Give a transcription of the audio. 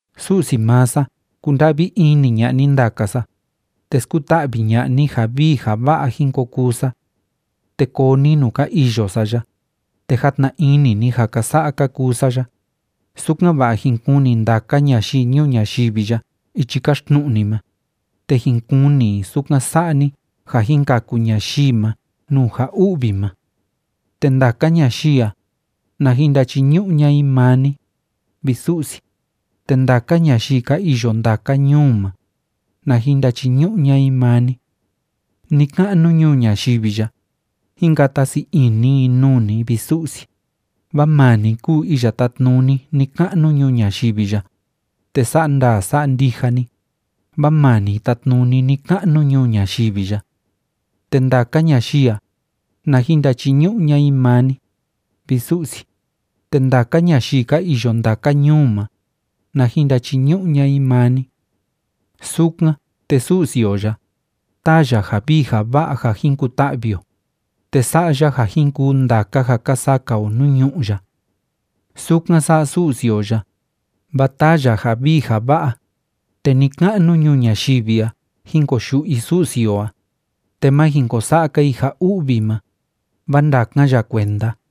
Su'si maa sa kunda'vi ini ña'a ni ndaka sa, te skuta'vi ña'a ni ja vii ja va'a jin ko kuu sa. Te koo ni nuu ka iyo sa ya, te jatna ini ni ja ka sa'a ka kuu sa ya, sukan‑va'a jin kuni ndaka ñayii ñuu ñayivi ya ichi káxtnu'u ni ma, te jin kuni i sukan sa'a ni ja jin kaku ñayii ma nuu ja u'vi ma. Te ndaka ñayii a, na jin ndachiñu'u ña'a i maa ni, vi Su'si, te ndaka ñayii ka iyo ndaka ñuu ma, na jin ndachiñu'u ña'a i maa ni. Ni‑ka'nu ñuu ñayivi ya, jín kata sii ini i nuu ni, vi Su'si, vaa maa ni kúu iya tátnuni ni‑ka'nu ñuu ñayivi ya, te sa'a ndaa sa'a ndija ni, vaa maa ni tátnuni ni‑ka'nu ñuu ñayivi ya. Te ndaka ñayii a, na jin ndachiñu'u ña'a i maa ni, vi Su'si, te ndaka ñayii ka iyo ndaka ñuu ma, na jin ndachiñu'u ña'a i maa ni. Sukan, te Su'si o ya, táa ya ja vii ja va'a ja jin kuta'vi o, te sa'a ya ja jin kuu ndaka ja ka saka o nuu ñu'ú ya. Sukan sa'a Su'si o ya, vaa taa ya ja vii ja va'a, te ni‑ka'nu ñuu ñayivi a jin koyu'u i Su'si o a, te ma jin ko sa'a‑ka i ja u'vi ma, vaa ndakan ya kuenda.